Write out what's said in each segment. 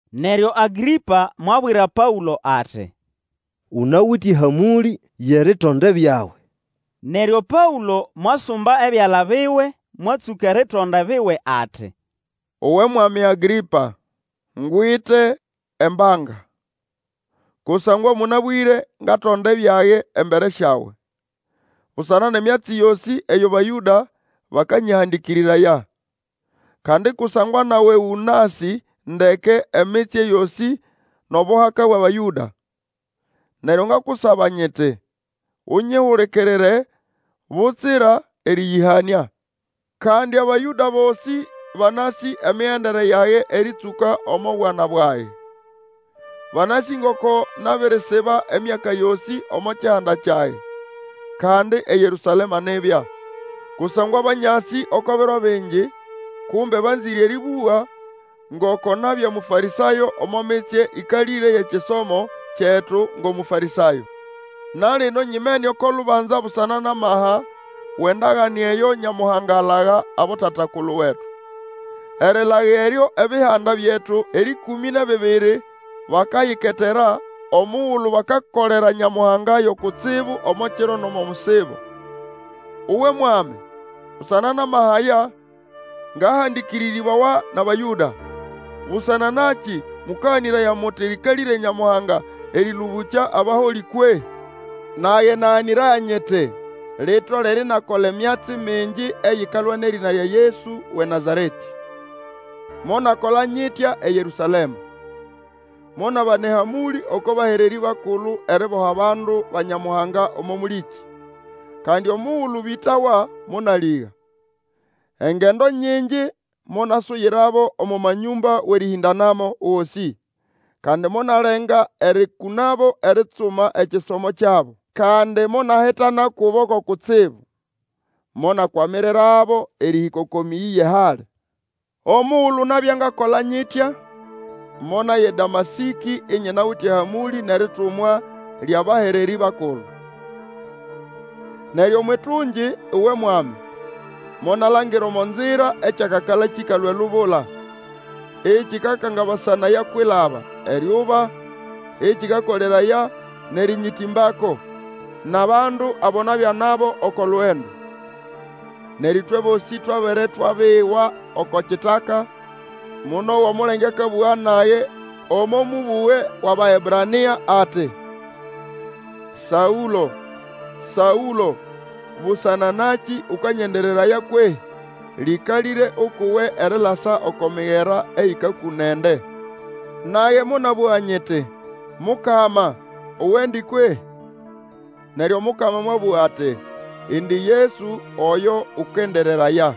Neryo Agrĩpa mwabwira Paũlo ati, Unawite ehamũlĩ yʼeritonda ebyawe. Neryo Paũlo mwasumba ebyala biwe, mwatsũka eritonda ebiwe ati, Uwe mwami Agrĩpa! Ngwite embanga, kusangwa mũnabwĩre ngatonda ebyage embere syawe, busana nʼemyatsi yosĩ eyo Bayũda bakanyĩhandĩkĩrĩraya. Kandi kusangwa nawe ũnasĩ ndeke emitsye yosĩ nʼobuhaka bwʼAbayũda. Neryo ngakusaba nyiti, Unyihulikirire, butsira erĩyĩhanĩa. Kandi Abayũda bosĩ banasĩ emigendere yage erĩtsũka omo bwana bwage. Banasĩ ngoko nabirisiba emyaka yosĩ omo kihanda kyage, kandi eYerũsalema nibya. Kusangwa banyasĩ oko biro bingi, kumbe banzĩre erĩbũga, ngoko nabya Mũfarĩsayo omo mitsye ĩkalĩre yʼekisomo kyetu ngʼOmũfarĩsayo. Na lino nyimene oko lubanza busana nʼamaha wʼendagane eyo Nyamuhanga alaga abotata-kulu wetu. Erilaga eryo ebihanda byetu erĩkũmĩ nʼebibiri, bakayiketera, omugulu bakakolera Nyamuhanga yo kutsibu omo kiro nʼomo musibo. Uwe Mwami! Busana nʼamaha aya, ngahandĩkĩrĩrĩbawa nʼAbayũda. Busana nakĩ mũkaganĩraya muti lĩkalĩre Nyamuhanga erĩlũbũkya abaholĩ kwehĩ? Nage naganĩraya nyiti, ritolere inakola emyatsi mingi eyikalwa nʼerĩna lya Yesu wʼeNazaretĩ. Monakola nyitya eYerũsalema. Monabana ehamũlĩ oko bahererĩ bakulu eriboha bandu ba Nyamuhanga omo mũlĩkĩ, kandi omugulu bĩtawa monalĩga. Engendo nyingi monasuyirabo omo manyũmba wʼerĩhĩndanamo gosĩ, kandi monalenga erĩkũnabo eritsuma ekisomo kyabo. Kandi monahitana kubo ko kutsibu, monakwamirirabo erĩhĩka oko mĩyĩ yʼehali. Omugulu nabya ngakola nyitya, monaya eDamasĩkĩ inyinawite ehamũlĩ nʼeritumwa lyʼabahererĩ bakulu. Neryo omwʼitungi, uwe mwami, monalangira omo nzira ekyakakala kĩkalũa elubula, ekĩkakangabasanaya kwilaba, eryuba, ekĩkakoleraya nʼerĩnyĩtĩmbako, nʼabandu abo nabya nabo oko lugendo. Neryo ĩtwe bosĩ twabere twabiwa oko kitaka, monowa omulenge akabũga nage, omo mũbũge wʼAbaebrania ati, Saũlo, Saũlo, busana nakĩ ũkanyendereraya kwehĩ? Lĩkalĩre ukʼuwe erilasa oko migera eyĩkakũna ende. Nage monabũga nyiti, Mukama, uwendi kwehĩ? Neryo Omukama mwabũga ati, Indi Yesu oyo ũkendereraya.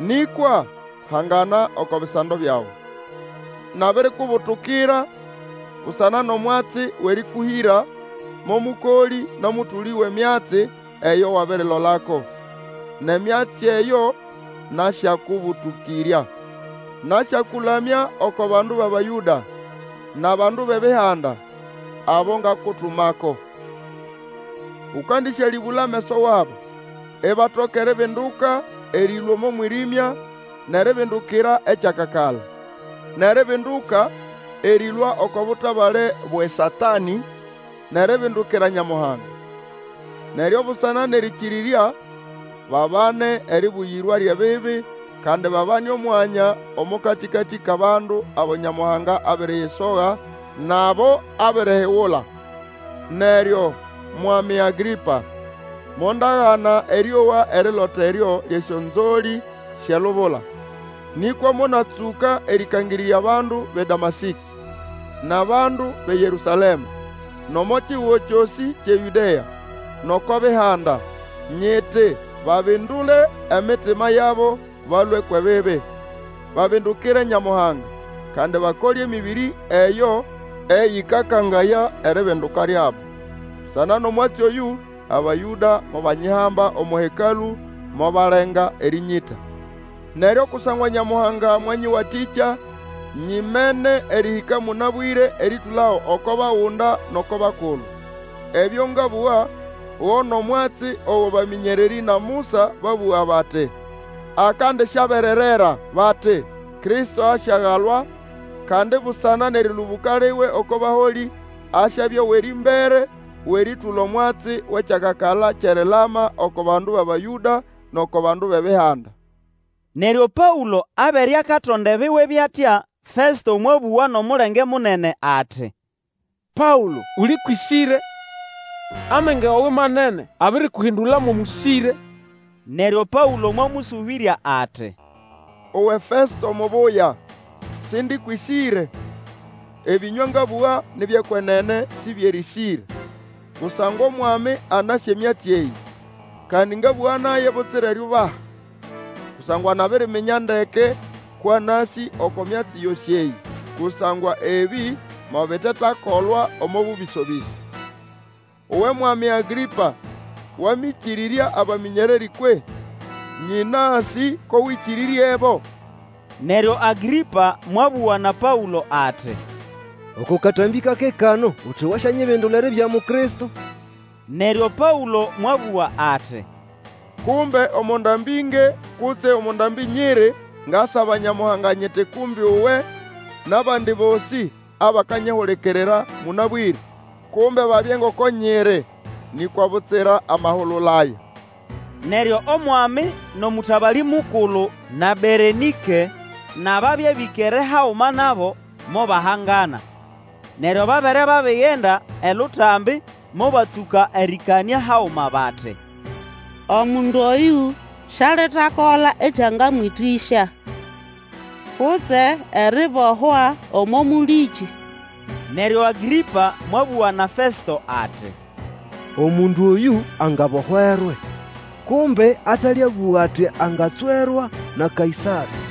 Nĩkwa, hangana oko bisando byawe. Nabirikubulukira busana nʼomwatsi wʼerĩkũhĩra mo mũkolĩ nʼomũtũlĩ wʼemyatsi eyo wabirilolako, nʼemyatsi eyo nasyakũbũlũkĩrya. Nasyakũlamya oko bandu bʼAbayũda, nʼabandu bʼEbihanda, abo ngakutumako. Ũkandisyalĩbũla ameso wabo, ibatoka eribinduka erĩlũa omo mwĩrĩmya nʼeribindukira ekyakakala, nʼeribinduka erĩlũa oko butabale bwʼeSatanĩ nʼeribindukira Nyamuhanga. Neryo busana nʼerĩnyĩkĩrĩrya babane eribuyirwa lyʼebibi, kandi babane omwanya omo katĩkatĩ kʼabandu abo Nyamuhanga abiriyisoga, nʼabo abirihigula. Neryo, Mwami Agrĩpa, mondagana erĩowa erilota eryo lyʼesyonzolĩ syʼelubula. Nĩkwa monatsũka erĩkangĩrĩrya bandu bʼeDamasĩkĩ, nʼabandu bʼeYerũsalema, nʼomo kihugo kyosĩ kyʼeYũdea, nʼoko Bihanda, nyiti babindule emitima yabo balũe kwʼebibi, babindukire Nyamuhanga, kandi bakole emĩbĩrĩ eyo eyĩkakangaya eribinduka lyabo. Busana nʼomwatsi oyũ Abayũda mobanyihamba omo Hekalũ, mobalenga erĩnyĩta. Neryo kusangwa Nyamuhanga mwanyĩwatĩkya, nyimene erihĩka mũnabwĩre erĩtũlago oko bagunda nʼoko bakulu. Ebyo ngabũga go nʼomwatsi ogo abamĩnyererĩ na Musa babũga bati akandisyabererera. Bati, Kristo asyagalwa, kandi busana nʼerĩlũbũka liwe oko baholĩ, asyabya owʼerĩmbere wʼerĩtũla omwatsi wʼekyakakala kyʼerilama oko bandu bʼAbayũda, nʼoko bandu bʼEbihanda. Neryo Paũlo abere akatonda ebiwe byʼatya, Festo mwabũga nʼomulenge munene ati, Paũlo, uli kwʼĩsĩre! Amenge wawe manene abirikuhindula mo mũsĩre! Neryo Paũlo mwamũsũbĩrya ati, Uwe Festo Mubuya, Sindi kwʼĩsĩre! Ebĩnywa ngabũga, ni byʼekwenene, si byʼerĩsĩre. Kusangwa omwami anasĩ emyatsi eyĩ, kandi ngabũga naye butsira eriubaha, kusangwa nabiriminya ndeke kwʼanasĩ oko myatsi yosĩ eyĩ, kusangwa ebĩ mobitetakolwa omo bũbĩso-bĩso. Uwe Mwami Agrĩpa Wamĩkĩrĩrya abamĩnyererĩ kwehĩ? Nyĩnasĩ ko wĩkĩrĩryebo. Neryo Agrĩpa mwabũga na Paũlo ati, Oko katambĩ kake kano uti wasyanyibindula eribya Mukristo! Neryo Paũlo mwabũga ati, Kumbe omo ndambĩ nge kutse omo ndambĩ nyiri, ngasaba Nyamuhanga nyiti kumbe uwe, nʼabandi bosĩ abakanyihulikirira mũnabwĩre, kumbe babye ngoko nyiri, nĩkwa butsira amahulula aya. Neryo omwami, nʼomũtabalĩ mukulu, na Berenĩke, nʼababya bĩkere haguma nabo, mobahangana. Neryo babere babigenda elutambi, mobatsũka erĩkanĩa haguma bati, Omundu oyũ sialitakola ekyangamwĩtĩsya, kutse eribohwa omo mũlĩkĩ. Neryo Agrĩpa mwabũga na Festo ati, Omundu oyũ angabohwerwe, kumbe ataliabũga ati angatswerwa na Kaĩsarĩ.